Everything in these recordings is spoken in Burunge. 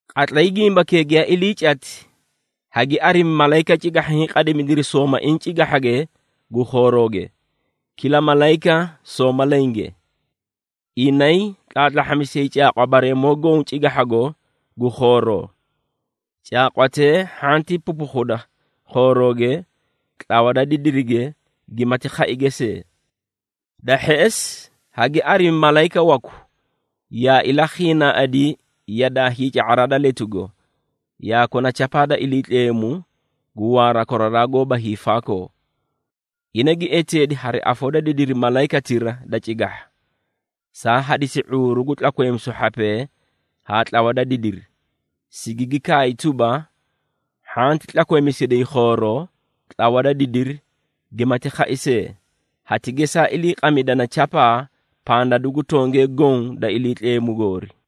Qatlay gimbakee giyaa ilii cati, hagi arimi malayika cigahha, hiĩ qadimidiri soomaiĩ cigahhage gu khoorooge, kila malayika sooma lenge. Inay tlaatlahhamisiyay caaqwa bareemoo goõ cigahhago gu khooroo, caaqwatee hhanti pupukhuda khoorooge, tlawa da didirige gimati khaige see. Da hheꞌesi, hagi arimi malayika waku, yaa ilakhiinaaꞌadi yadaa hiica⁄araa da letugo, yaa kona chapaa da Iliitleemu, gu waara koraraa goóba hiifaakoo. Ina gi eteedi hari afoo da didiri malayikatira da cigahha, saa hadisi ⁄uuru gu tlakweemisu hhapee haa tlawa da didiri, sigigi kaay tuba, “Hhanti tlakweemisiday khooroo, tlawa da didiri gimati khai see, hati gesaa iliiqamidana chapaa pandadu gu tongee goõ da Iliitleemu goori.”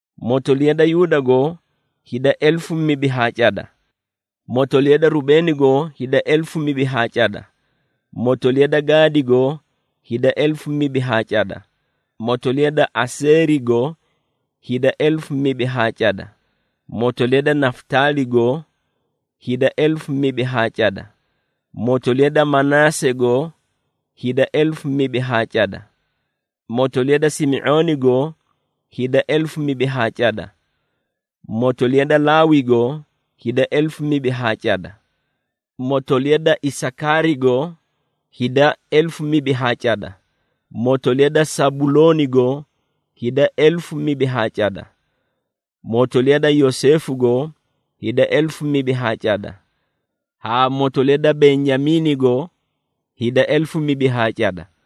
Motoliya da Yuudago hida elefu mibi haa cada, motoliya da Rubeenigo hida elefu mibi haa cada, motoliya da Gaadigo hida elefu mibi haa cada motoliya da Aseerigo hida elefu mibi haa cada, motoliya da Nafutaaligo hida elefu mibi haa cada, motoliya da Manaasego hida elefu mibi haa cada, motoliya da Simi⁄oonigo hida elefu mibi haa cada, motoliya da Laawigo hida elefu mibi haa cada, motoliya da Isakaarigo hida elefu mibi haa cada, motoliya da Sabuloonigo hida elefu mibi haa cada, motoliya da Yoseefugo hida elefu mibi haa cada, haa motoliya da Benyamiinigo hida elefu mibi haa cada.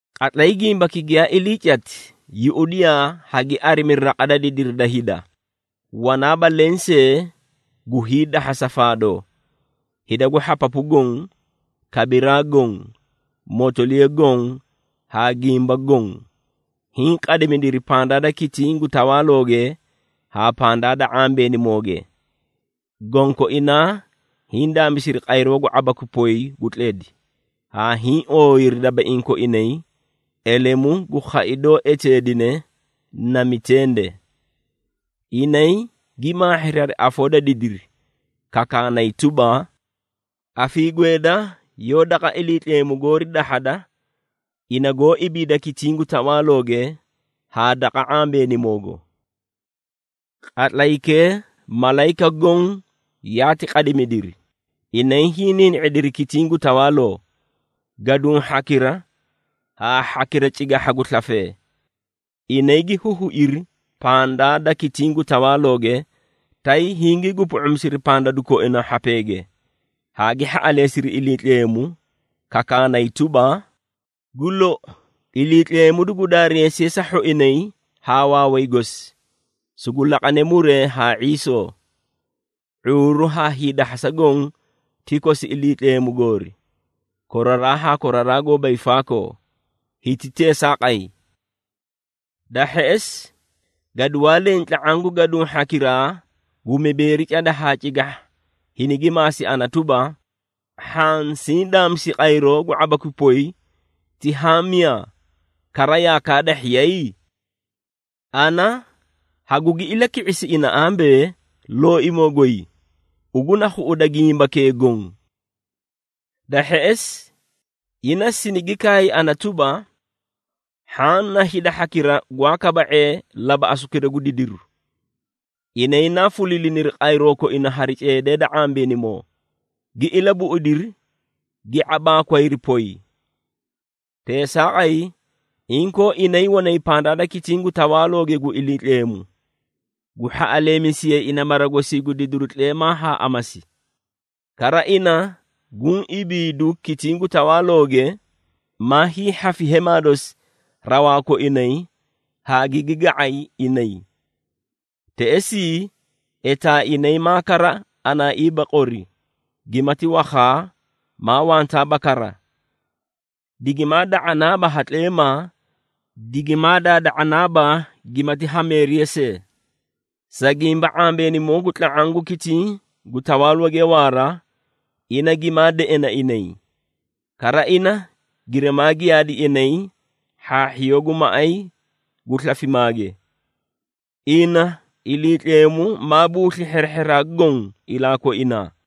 Qatlay gimbaki giyaa ilii cati, yuꞌudiyaa, hagi arimi raqa da didiri da hida, wanaaba leẽ see gu hiidahhasa faadoo. Hida gu hhapapu goõ, kabiraa goõ, motoliya goõ haa gimba goõ, hiĩ qadimidiri pandaa da kitiĩ gu tawaalooge haa pandaa da ⁄ambeenimooge. Gonkoinaa hiĩ daamisiri qayroo gu ⁄abakwi poy gu tledi, haa hiĩ ooyiri dabaiĩ koinay elemu gu khai doó eteedine na mitende. Inay gi maahhiri hari afoo da didiri, kakaanay tuba, “Afiigweeda yoó daqa Iliitleemu goori dahhada ina goó ibiida kitiĩ gu tawaalooge, haa daqa ⁄ambeenimoogo.” Qatlaykee, malayika goõ yaati qadimidiri, inay hiĩ niini⁄idiri kitiĩ gu tawaaloo, gaduũ hhakira haa hhakira cigahha gu slafee. Inay gi huhuiri pandaa da kitiĩ gu tawaalooge, tay hingii gupu⁄umisiri pandadu koina hhapee, haa gi hhaꞌaleesiri Iliitleemu, kakaanay tuba, “Gu lou! Iliitleemu dugu daareesiye sa hhoinay haa waaway gosi, sugu laqane muree haa ⁄iisoo, ⁄uuru haa hiidahhasa goõ ti kosi Iliitleemu goori, koraraa haa koraraa goóba hiifaakoo! Hiti teesaaqay!” Da hheꞌesi, gaduwaa leẽ tla⁄aã gu gaduũ hhakiraa gu mibeeri cada haa cigahha hinigi maasi ana tuba, “Hhaã siĩ daamisi qayroo gu ⁄abakwi poy ti haã miyaa, kara yaa kaadahhiyay?” Ana hagugi ilaki⁄isi ina ambee, “Looimoo goy, ugu na khuꞌuda gimbakee goõ.” Da hheꞌesi, ina sinigi kaay ana tuba, “Hhaã na hida hhakira gwaa kaba⁄ee labaꞌasukira gu didiru. Inay naa fuliiliniri qayroo koina hari ceedee da ⁄ambeenimoo,” gi ilabuꞌudiri, gi ⁄abaakwayri poy. Teesaaqay, inkoo inay wanay pandaa da kitiĩ gu tawaalooge gu Iliitleemu, gu hhaꞌaleemisiyay ina mara gosii gu didiru tleemaa haa amasi. Kara ina guũ ibiidu kitiĩ gu tawaalooge, maa hiihhafi hemaa dosi rawaa koinay haa gigi ga⁄ay inay. Teꞌesii, etaa inay maa kara anaaiiba qori, gimati wakhaa maa wantaaba kara. Digimaa da⁄anaaba ha tleemaa, digimaa daada⁄anaaba gimati hameeriya see. Sa gimba, ⁄ambeenimoo gu tla⁄aã gu kitiĩ gu tawaalooge waara, ina gimaa deꞌena inay, kara ina girimaa giyaadi inay hhaahhiyoo gu maꞌay gu slafimaage. Ina, Iliitleemu maa buusli hherehheraa goõ ilaa koinaa.